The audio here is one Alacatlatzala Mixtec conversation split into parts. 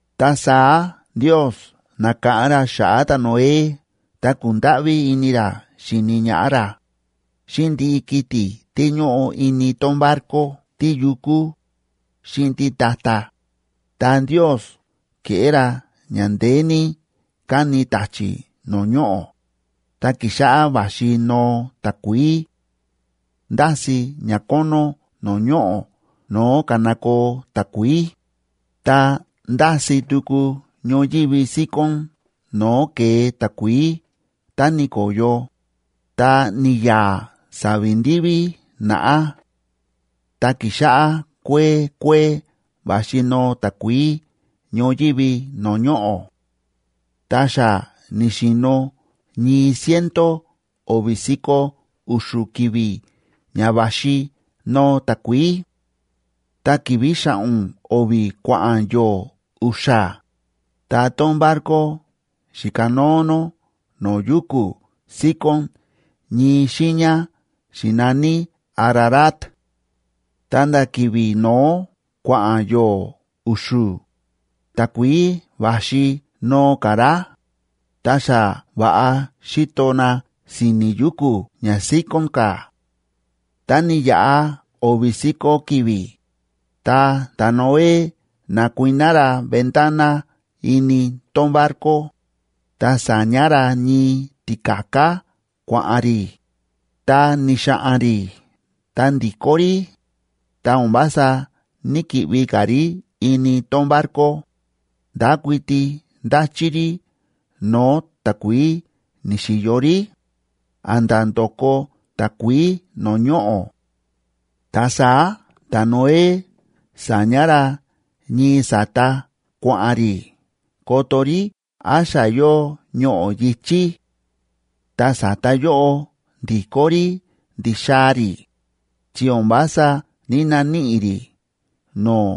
Ta saá Ndios na̱káꞌán ra xa̱ꞌa̱ ta̱Noé ta kúndáꞌví ini ra xíni ñaꞌá ra, xíꞌin ndiꞌi kiti̱ tí ñóꞌo ini tón barco, tíyukú xíꞌin títa̱ta̱. Ta Ndios ke̱ꞌé ra ña ndeé ní káni ta̱chi̱ no̱o̱ ñoꞌo̱, ta ki̱xáꞌá va̱xi noo takuií. Ndási̱ ñakónó no̱o̱ ñoꞌo̱ no̱o̱ ka̱nakoo takuií, ta ndási̱ tuku ñoyívi síkón no̱o̱ ke̱e takuií tá ni̱ko̱yo, ta ni̱ya̱a̱ sa̱vi̱ ndiví naꞌá. Ta ki̱xáꞌá kuee kuee va̱xi noo takuií ñoyívi no̱o̱ ñoꞌo̱. Ta xa ni̱xi̱no̱ ñii ciento o̱vi̱ si̱ko̱ u̱xu̱ ki̱vi̱ ña va̱xi noo takuií. Ta ki̱vi̱ xa̱ꞌo̱n o̱vi̱ kua̱ꞌa̱n yo̱o̱ u̱xa̱, ta tón barco xi̱kanóo nó no̱o̱ yuku̱ síkón ñii xiiña xi̱naní Ararat. Ta̱nda̱ ki̱vi̱ no̱ó kua̱ꞌa̱n yo̱o̱ u̱xu̱, takuií va̱xi noo ka̱ rá, ta xa va̱ꞌa xi̱to na si̱ni̱ yuku̱ ña síkón ka̱. Ta ni̱yaꞌa o̱vi̱ si̱ko̱ ki̱vi̱, ta ta̱Noé na̱kuiná ra ventana ini tón barco, ta sa̱ña ra ñii ti̱ka̱ká kua̱ꞌa̱n rí, ta ni̱xa̱ꞌa̱n rí ta ndi̱kó rí, ta o̱n vása ní‑kiꞌvi ka̱ rí ini tón barco, ndákuiti ndáchí rí no̱o̱ takuií ni̱xi̱yo rí, a̱nda̱ ndoko takuií no̱o̱ ñoꞌo̱. Ta saá ta̱Noé sa̱ña ra ñii sa̱ta kua̱ꞌa̱n rí koto rí án xa yóo ñoꞌo̱ yi̱chí. Ta sa̱ta yóꞌo ndi̱kó rí ndi̱xaa̱ rí, chi o̱n vása ní‑naníꞌi rí no̱o̱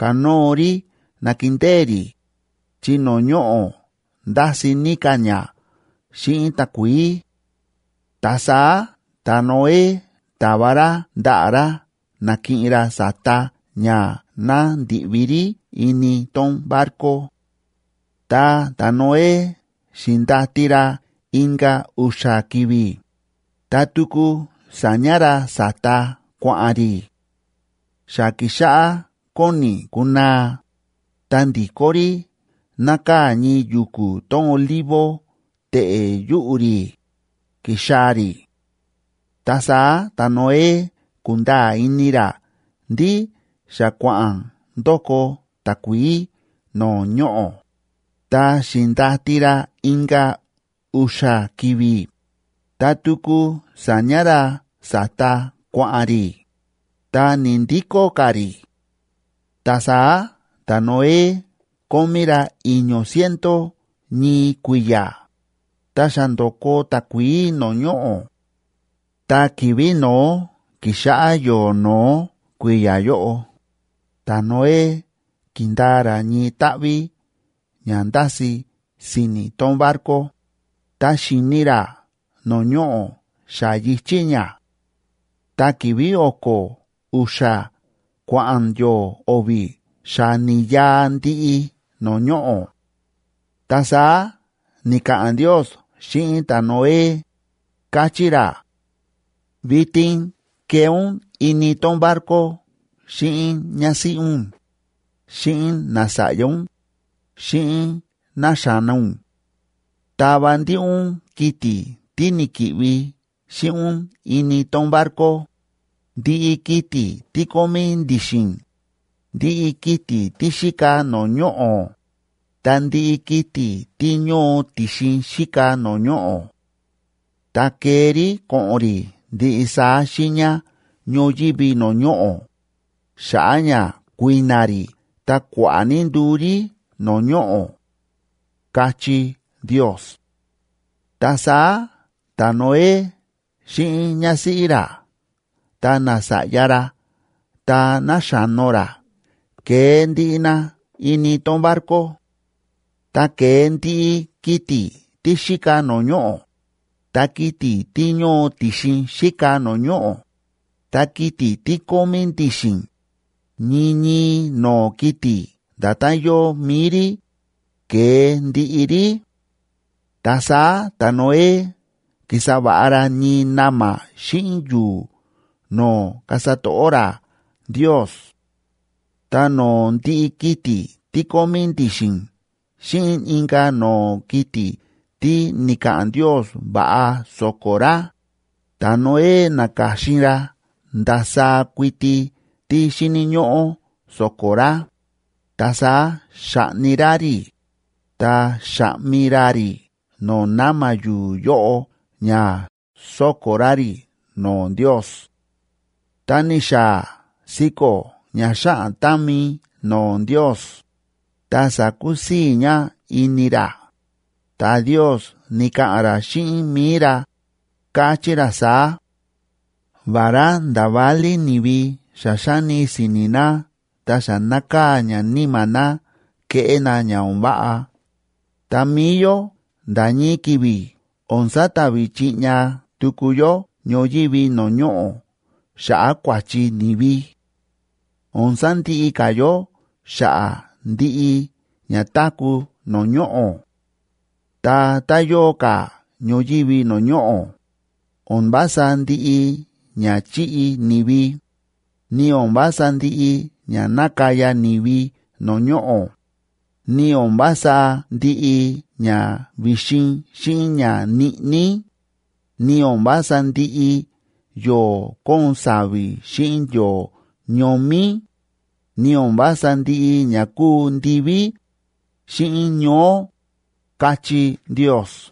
kanóo rí nakindée rí, chi no̱o̱ ñoꞌo̱ ndási̱ ní ka̱ ña xíꞌin takuií. Ta saá ta̱Noé ta̱va ra ndaꞌa̱ ra nakiꞌin ra sa̱ta ña ná ndi̱ꞌvi rí ini tón barco. Ta ta̱Noé xi̱ndati ra inka̱ u̱xa̱ ki̱vi̱, ta tuku sa̱ña ra sa̱ta kua̱ꞌa̱n rí. Xa ki̱xáꞌá kóni kunaa, ta ndi̱kó rí nákaa̱ ñii yu̱ku̱ tón olivo teꞌe̱ yuꞌu̱ rí, ki̱xaa̱ rí. Ta saá ta̱Noé ku̱nda̱a̱ ini ra ndí xa kua̱ꞌa̱n ndoko takuií no̱o̱ ñoꞌo̱. Ta xi̱ndati ra inka̱ u̱xa̱ ki̱vi̱, ta tuku sa̱ña ra sa̱ta kua̱ꞌa̱n rí, ta ni̱‑ndikó ka̱ rí. Ta saá ta̱Noé kómí ra i̱ño̱ ciento ñii kui̱ya̱, ta xa ndo̱ko takuií no̱o̱ ñoꞌo̱. Ta ki̱vi̱ no̱ó kíxáꞌá yo̱o̱ no̱ó kui̱ya̱ yóꞌo, ta̱Noé ki̱ndaa ra ñii táꞌví ña ndási̱ si̱ni̱ tón barco, ta xi̱ni ra no̱o̱ ñoꞌo̱ xa yi̱chí ña. Ta ki̱vi̱ o̱ko̱ u̱xa̱ kua̱ꞌa̱n yo̱o̱ o̱vi̱ xa ni̱ya̱a̱ ndiꞌi no̱o̱ ñoꞌo̱. Ta saá ni̱ka̱ꞌa̱n Ndios xíꞌin ta̱Noé, káchí ra: ―Vitin kee ún ini tón barco xíꞌin ñásíꞌí ún, xíꞌin nasa̱ꞌya ún, xíꞌin náxa̱no ún. Tava ndiꞌi ún kiti̱ tí ni̱ki̱ꞌvi xíꞌin ún ini tón barco, ndiꞌi kiti̱ tí kómí ndi̱xi̱n, ndiꞌi kiti̱ tí xíka no̱o̱ ñoꞌo̱, ta ndiꞌi kiti̱ tí ñóo ti̱xin xíka no̱o̱ ñoꞌo̱. Ta kee rí ko̱ꞌo̱n rí ndiꞌi saá xiiña ñoyívi no̱o̱ ñoꞌo̱, xa̱ꞌa̱ ña kui̱na̱ rí ta kua̱ꞌa̱ ní nduu rí no̱o̱ ñoꞌo̱ ―káchí Ndios. Ta saá ta̱Noé xíꞌin ñásíꞌí ra ta nasa̱ꞌya ra ta náxa̱no ra ke̱e ndiꞌi na ini tón barco. Ta ke̱e ndiꞌi kiti̱ tí xíka no̱o̱ ñoꞌo̱, ta kiti̱ tí ñóo ti̱xin xíka no̱o̱ ñoꞌo̱, ta kiti̱ tí kómí ndi̱xi̱n, ñii ñii no̱o̱ kiti̱ nda̱tán yóo mi̱i rí, ke̱e ndiꞌi rí. Ta saá ta̱Noé ki̱sa va̱ꞌa ra ñii na̱ma̱ xíꞌin yu̱u̱ no̱o̱ kasa to̱ꞌó ra Ndios.a Ta no̱o̱ ndiꞌi kiti̱ tí kómí ndi̱xi̱n xíꞌin inka̱ no̱o̱ kiti̱ tí ni̱ka̱ꞌa̱n Ndios va̱ꞌa so̱ko̱ ra, ta̱Noé na̱ka̱xin ra ndasaá kuiti tí xíni̱ ñóꞌó so̱ko̱ ra, ta saá xa̱ꞌni ra rí, ta xa̱ꞌmi ra rí no̱o̱ na̱ma̱ yu̱u̱ yóꞌo ña so̱ko̱ ra rí no̱o̱ Ndios. Ta ni̱xaa̱ siko̱ ña xáꞌan támi no̱o̱ Ndios, ta sa̱kusii̱ ña ini ra, ta Ndios ni̱ka̱ꞌa̱n ra xíꞌin mi̱i ra, káchí ra saá: “Vará nda̱ válí ni̱vi xa xáni si̱ni̱ na ta xa nákaa̱ ña níma̱ na keꞌé na ña o̱n váꞌa, ta mi̱i yó nda̱ ñii ki̱vi̱ o̱n sata̱vi̱ chiꞌña tuku yó ñoyívi no̱o̱ ñoꞌo̱ xa̱ꞌa̱ kua̱chi ni̱vi. O̱n sandiꞌi ka̱ yó xa̱ꞌa̱ ndiꞌi ña táku̱ no̱o̱ ñoꞌo̱. Ta tá yóo ka̱ ñoyívi no̱o̱ ñoꞌo̱, o̱n vása ndiꞌi ña chíꞌi ni̱vi, ni o̱n vása ndiꞌi ña nákaya ni̱vi no̱o̱ ñoꞌo̱, ni o̱n vása ndiꞌi ña vi̱xin xíꞌin ña ñiꞌní, ni o̱n vása ndiꞌi yo̱o̱ kóon sa̱vi̱ xíꞌin yo̱o̱ ñomí, ni o̱n vása ndiꞌi ña kúu ndiví xíꞌin ñoó”, káchí Ndios.